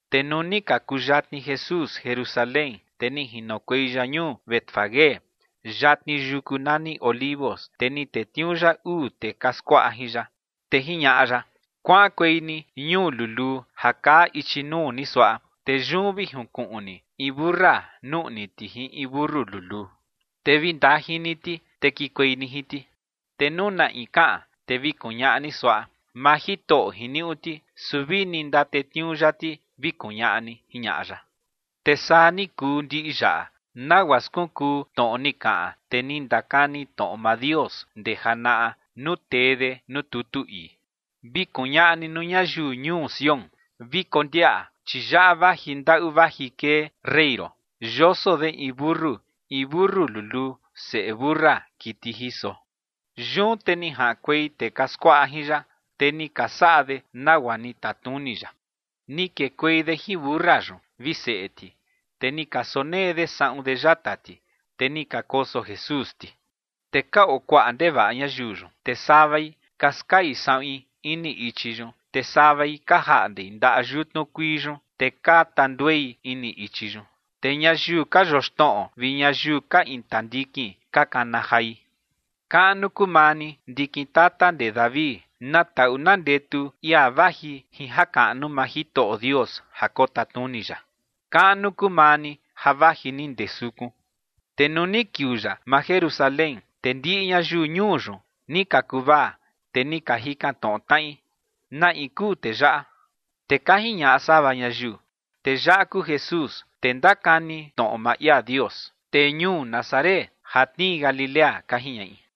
Te nuu ni ka kuyatni Jesús Jerusalén, te ni jinokuei ya ñuu Betfagé yatni yuku nani Olivos, te ni tetniuu ya uu tee ka skuaꞌa jin ya. Te jiñaꞌa ya: ͏―͏Kuaꞌankuei ni ñuu luluu ja kaa ichi nuu ni suaꞌa, te yun vi junkuꞌun ni in mentu siꞌi nuꞌni ti jin in mentu luluu, te vi ndajin ni ti, te kikuei ni jin ti. Te nuu na in kaꞌan, te vi kuñaꞌa ni suaꞌa: “Maa Jitoꞌo jiniuꞌu ti, su vini ndatetniuu ya ti” vi kuñaꞌa ni ͏―͏jiñaꞌa ya. Te saa ni kuu ndiꞌi yaꞌa, nagua skunkuu tnoꞌo ni kaꞌan tee ni ndakani tnoꞌo maa Dios ndee janaꞌa nuu tee de nuu tutu ii: Vi kuñaꞌa ni nuu ñayiu ñuu Sión: “Vi kondiaꞌa, chi yaꞌa vaji ndaꞌu vaji kee rey ron, yoso de in mentu, in mentu luluu, seꞌe mentu siꞌi kiti jiso”. Yun te ni jaꞌankuei tee ka skuaꞌa jin ya, te ni ka saꞌa de nagua ni tatnuni ya. Ni kekuei de jin mentu siꞌi yun vi seꞌe ti, te ni ka sonee de saꞌun de yata ti, te ni ka koso Jesús ti. Te ka oo kuaꞌa ndevaꞌa ñayiu yun, te savai ka skai saꞌuin ini ichi yun, te savai ka jaꞌnde ndaꞌa yutnu kuii yun, te ka tanduei ini ichi yun. Te ñayiu ka yoxnoꞌo vi ñayiu ka intandikin ka kana jai: ͏―͏¡Kaꞌnu kuu maa ni, ndikin tata ndee David! ¡Na taꞌu na ndetu ia vaji jin jakaꞌnu maa Jitoꞌo Dios ja kotatnuni ya! Kaꞌnu kuu maa ni ja vaji ni ndee sukun. Te nuu ni kiuu ya maa Jerusalén, te ndiꞌi ñayiu ñuu yun ni ka kuvaa, te ni ka jikan tnoꞌo tnaꞌi: ͏―͏¿Na in kuu tee yaꞌa? Te ka jiñaꞌa sava ñayiu: ͏―͏Tee yaꞌa kuu Jesús, tee ndakani tnoꞌo maa ia Dios, tee ñuu Nazaret ja tnii Galilea ͏―͏ka jiñaꞌi.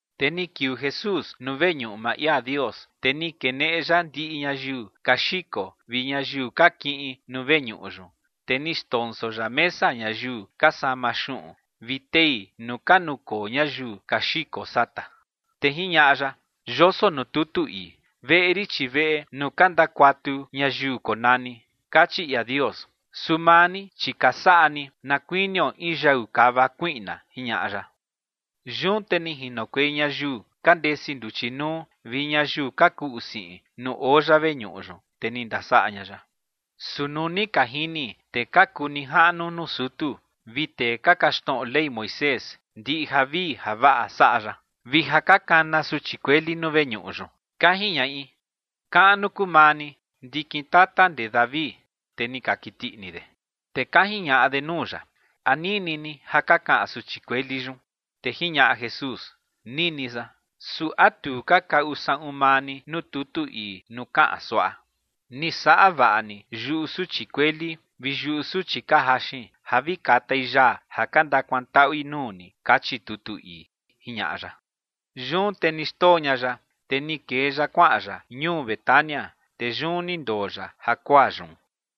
Te ni kiuu Jesús nuu veñuꞌu maa ia Dios, te ni keneꞌe ya ndiꞌi ñayiu ka xiko vi ñayiu ka kiꞌin nuu veñuꞌu yun, te ni xndonso ya mesa ñayiu ka sama xuꞌun vi tei nuu ka nukoo ñayiu ka xiko sata. Te jiñaꞌa ya: ͏―͏Yoso nuu tutu ii: “Veꞌe rin, chi veꞌe nuu ka ndakuatu ñayiu konani”, kachi ia Dios. Su maa ni, chi ka saꞌa ni na kuinio in yau kava kuiꞌna ͏―͏jiñaꞌa ya. Yun te ni jinokuei ñayiu ka ndesi nduchi nuu vi ñayiu ka kuꞌu siꞌin nuu oo ya veñuꞌu yun, te ni ndasaꞌa ña ya. Su nuu ni ka jini tee ka kuu nijaꞌnu nuu sutu vi tee ka kaxtnoꞌo Ley Moisés, ndiꞌi javii javaꞌa saꞌa ya, vi ja ka kana suchi kueli nuu veñuꞌu yun, ka jiñaꞌi: “¡Kaꞌnu kuu maa ni, ndikin tata ndee David!”, te ni ka kiti ini de. Te ka jiñaꞌa de nuu ya: ͏―͏¿A nini ni ja ka kaꞌan suchi kueli yun? Te jiñaꞌa Jesús: ͏―͏Nini san. ¿Su a tu ka kaꞌu saꞌun maa ni nuu tutu ii nuu kaꞌan suaꞌa: “Ni saꞌa vaꞌa ni yuꞌu suchi kueli vi yuꞌu suchi ka jaxin ja vi katai yaa ja ka ndakuantaꞌui nuu ni”?, kachi tutu ii ͏―͏jiñaꞌa ya. Yun te ni xndoo ña ya, te ni kee ya kuaꞌan ya ñuu Betania, te yun ni ndoo ya jakuaa yun.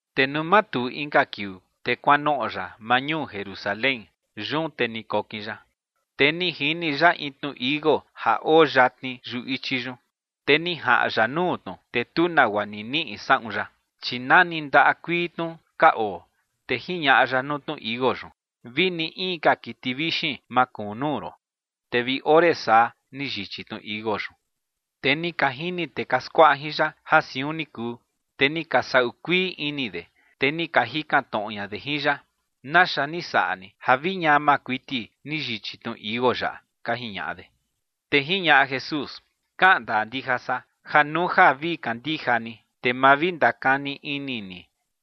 Te nuu matuu inka kiuu, te kuanoꞌo ya maa ñuu Jerusalén. Yun te ni kokin ya. Te ni jini ya in tnu tichi iuu ja oo yatni yuꞌu ichi yun, te ni jaꞌan ya nuu tnu, te tu nagua ni niꞌi saꞌun ya, chi nani ndaꞌa kuii tnu ka oo. Te jiñaꞌa ya nuu tnu tichi iuu yun: ͏―͏Vini in ka kiti vixin ma kuun nuu ron. Te vi ore saa ni yichi tnu tichi iuu yun. Te ni ka jini tee ka skuaꞌa jin ya ja siun ni kuu, te ni ka sau kuii ini de, te ni ka jikan tnoꞌo ña de jin ya: ͏―͏¿Naxa ni saꞌa ni ja vi ñama kuiti ni yichi tnu tichi iuu yaꞌa? ͏―͏ka jiñaꞌa de. Te jiñaꞌa Jesús: ͏―͏Kaꞌan ndaa ndija san ja nuu ja vi kandija ni, te ma vi ndakani ini ni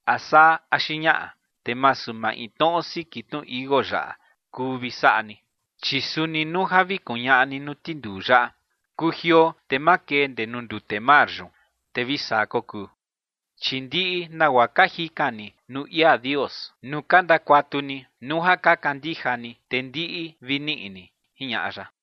a saa axi ñaꞌa, te masu maintnoꞌo siki tnu tichi iuu yaꞌa kuu vi saꞌa ni, chi suni nuu ja vi kuñaꞌa ni nuu tinduu yaꞌa: “Kujioo te makee ndee nuu ndute mar yun”, te vi saa kokuu. Chi ndiꞌi nagua ka jikan ni nuu ia Dios nuu ka ndakuatu ni, nuu ja ka kandija ni, te ndiꞌi vi niꞌi ni ͏―͏jiñaꞌa ya.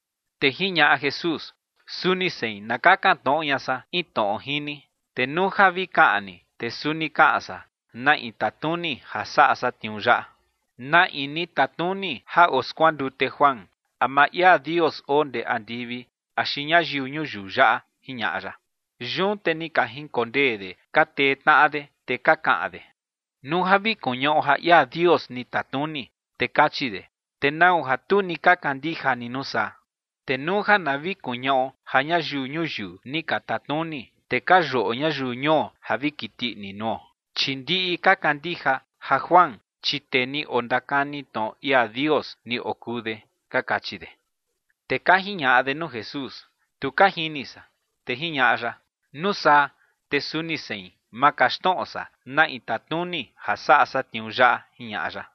Te jiñaꞌa Jesús: ͏―͏Suni sein na kakan tnoꞌo ña san in tnoꞌo jin ni. Te nuu ja vi kaꞌan ni, te suni kaꞌan san na in tatnuni ja saꞌa san tniuu yaꞌa. ¿Na in ni tatnuni ja oskuandute Juan? ¿A maa ia Dios oo ndee andivi, axi ñayiu ñuyiu yaꞌa? ͏―͏jiñaꞌa ya. Yun te ni ka jinkondee de ka tee tnaꞌa de, te ka kaꞌan de: ͏―͏Nuu ja vi kuñaꞌo ja ia Dios ni tatnuni, te kachi de: “¿Te nau ja tu ni ka kandija ni nuu saa?” Te nuu ja na vi kuñaꞌo ja ñayiu ñuyiu ni ka tatnuni, te ka yuꞌo ñayiu ñuo ja vi kiti ini nuo, chi ndiꞌi ka kandija ja Juan, chi tee ni ondakani tnoꞌo ia Dios ni okuu de ͏―͏ka kachi de. Te ka jiñaꞌa de nuu Jesús: ͏―͏Tu ka jini san. Te jiñaꞌa ya: ͏―͏Nuu saa te suni sein ma kaxtnoꞌo san na in tatnuni ja saꞌa san tniuu yaꞌa ͏―͏jiñaꞌa ya.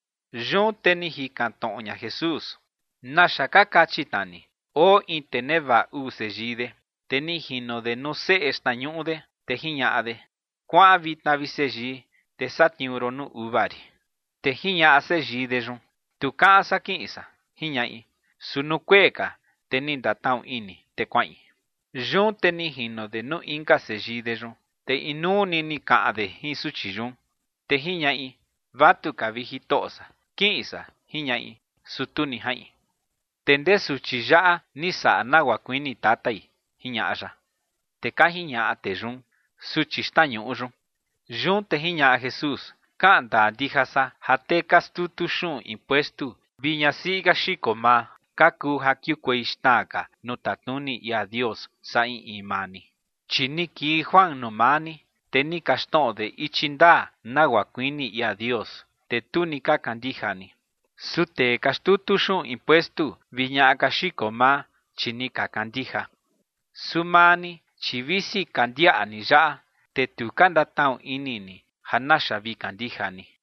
Yun te ni jikan tnoꞌo ña Jesús: ͏―͏¿Naxa ka kachi tna ni? Oo in tee nevaꞌa uu seyii de, te ni jino de nuu seꞌe xtnañuꞌu de, te jiñaꞌa de: “Kuaꞌan vitna, vi seyii, te satniuu ron nuu uva rin”. Te jiñaꞌa seyii de yun: “Tu kaꞌan san kiꞌin san”, jiñaꞌi. Su nuu kuee ka, te ni ndatnaꞌu ini, te kuaꞌin. Yun te ni jino de nuu inka seyii de yun, te inuu ni ni kaꞌan de jin suchi yun. Te jiñaꞌi: “Vatuka, vi jitoꞌo san, kiꞌin san”, jiñaꞌi. Su tu ni jaꞌin. ¿Te ndee suchi yaꞌa ni saꞌa nagua kuini tatai? ͏―͏jiñaꞌa ya. Te ka jiñaꞌa tee yun: ͏―͏Suchi xtnañuꞌu yun. Yun te jiñaꞌa Jesús: ͏―͏Kaꞌan ndaa ndija san ja tee ka xtutu xuꞌun impuestu vi ñasiꞌi ka xiko maa, ka kuu ja kiukuei xna ka nuu tatnuni ia Dios saa in in maa ni. Chi ni kii Juan nuu maa ni, te ni kaxtnoꞌo de ichi ndaa, nagua kuini ia Dios, te tu ni ka kandija ni. Su tee ka xtutu xuꞌun impuestu vi ñaꞌa ka xiko maa, chi ni ka kandija. Su maa ni, chi visi ka ndiaꞌa ni yaꞌa, te tu ka ndatnaꞌu ini ni ja naxa vi kandija ni.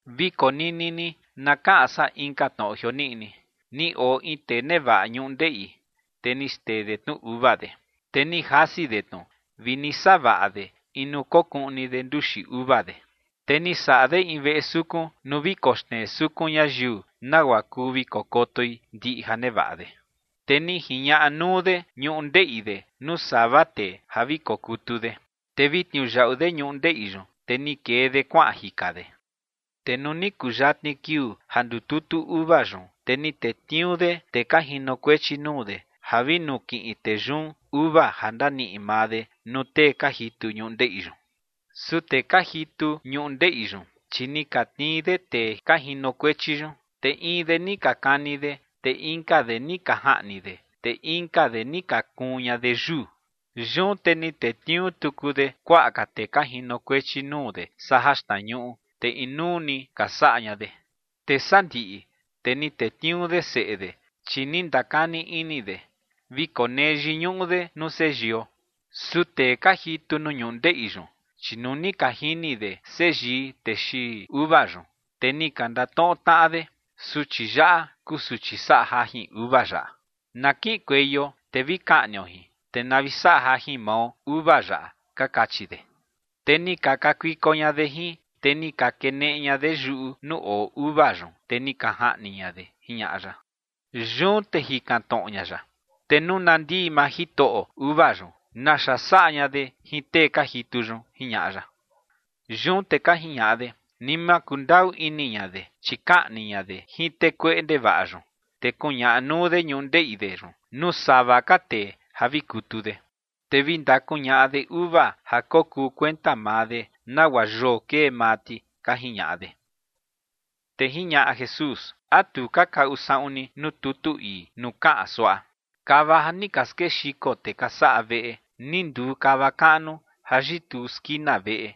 ’Vi konini ni na kaꞌan san inka tnoꞌo jioniꞌi. Ni oo in tee nevaꞌa ñundeꞌi, te ni xtee de tnu uva de, te ni jasi de tnu vi ni savaꞌa de in nuu kokuꞌni de nduxi uva de, te ni saꞌa de in veꞌe sukun nuu vi koxnee sukun ñayiu, nagua kuu vi kokotoi ndiꞌi ja nevaꞌa de, te ni jiñaꞌa nuu de ñundeꞌi de nuu sava tee ja vi kokutu de, te vi tniuyaꞌu de ñundeꞌi yun, te ni kee de kuaꞌan jika de. Te nuu ni kuyatni kiuu ja ndututu uva yun, te ni tetniuu de tee ka jinokuechi nuu de ja vi nukiꞌin tee yun uva ja ndaniꞌi maa de nuu tee ka jitu ñundeꞌi yun. Su tee ka jitu ñundeꞌi yun, chi ni ka tnii de tee ka jinokuechi yun, te in de ni ka kani de, te inka de ni ka jaꞌni de, te inka de ni ka kuun ña de yuu. Yun te ni tetniuu tuku de kuaꞌa ka tee ka jinokuechi nuu de saa jaxtnañuꞌu, te inuu ni ka saꞌa ña de. ’Te sandiꞌi, te ni tetniuu de seꞌe de, chi ni ndakani ini de: “Vi konee yiñuꞌu de nuu seyio”. Su tee ka jitu nuu ñundeꞌi yun, chi nuu ni ka jini de seyii tee xiin uva yun, te ni ka ndatnoꞌo tnaꞌa de: “Suchi yaꞌa kuu suchi saꞌa jajin uva yaꞌa. Na kiꞌinkueio te vi kaꞌnio jin, te na vi saꞌa jajin mao uva yaꞌa”, ka kachi de. Te ni ka kakuiko ña de jin, te ni ka keneꞌe ña de yuꞌu nuu oo uva yun, te ni ka jaꞌni ña de ͏―͏jiñaꞌa ya. Yun te jikan tnoꞌo ña ya: ͏―͏Te nuu na ndii maa jitoꞌo uva yun, ¿naxa saꞌa ña de jin tee ka jitu yun? ͏―͏jiñaꞌa ya. Yun te ka jiñaꞌa de: ͏―͏Ni ma kundaꞌu ini ña de, chi kaꞌni ña de jin tee kueꞌe ndevaꞌa yun, te kuñaꞌa nuu de ñundeꞌi de yun nuu sava ka tee ja vi kutu de, te vi ndakuñaꞌa de uva ja kokuu kuenta maa de, nagua yoo kee maa ti ͏―͏ka jiñaꞌa de. Te jiñaꞌa Jesús: ͏―͏¿A tu ka kaꞌu saꞌun ni nuu tutu ii nuu kaꞌan suaꞌa: Kava ja ni ka skexiko tee ka saꞌa veꞌe, ni nduu kava kaꞌnu ja yituu skina veꞌe,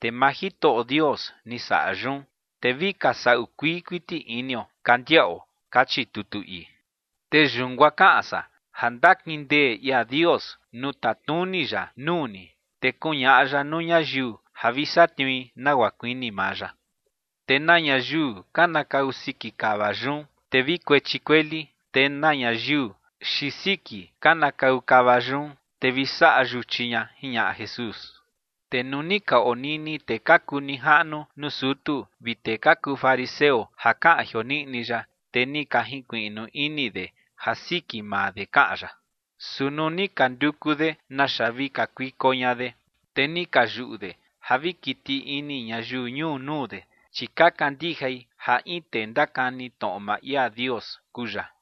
te maa Jitoꞌo Dios ni saꞌa yun, te vi ka saꞌu kuii kuiti inio ka ndiaꞌo? Kachi tutu ii. ’Te yun guaa kaꞌan san ja ndakindee ia Dios nuu tatnuni ya nuu ni, te kuñaꞌa ya nuu ñayiu ja vi satniui nagua kuini maa ya. Te na ñayiu kanakau siki kava yun, te vi kuechi kueli. Te na ñayiu xiin siki kanakau kava yun, te vi saꞌa yuchi ña ͏―͏jiñaꞌa Jesús. Te nuu ka onini tee ka kuu nijaꞌnu nuu sutu vi tee ka kuu fariseo ja kaꞌan jioniꞌi ya, te ni ka jinkuiꞌnu ini de ja siki maa de kaꞌan ya. Su nuu ni ka nduku de naxa vi kakuiko ña de, te ni ka yuꞌu de ja vi kiti ini ñayiu ñuu nuu de, chi ka kandijai ja in tee ndakani tnoꞌo maa ia Dios kuu ya.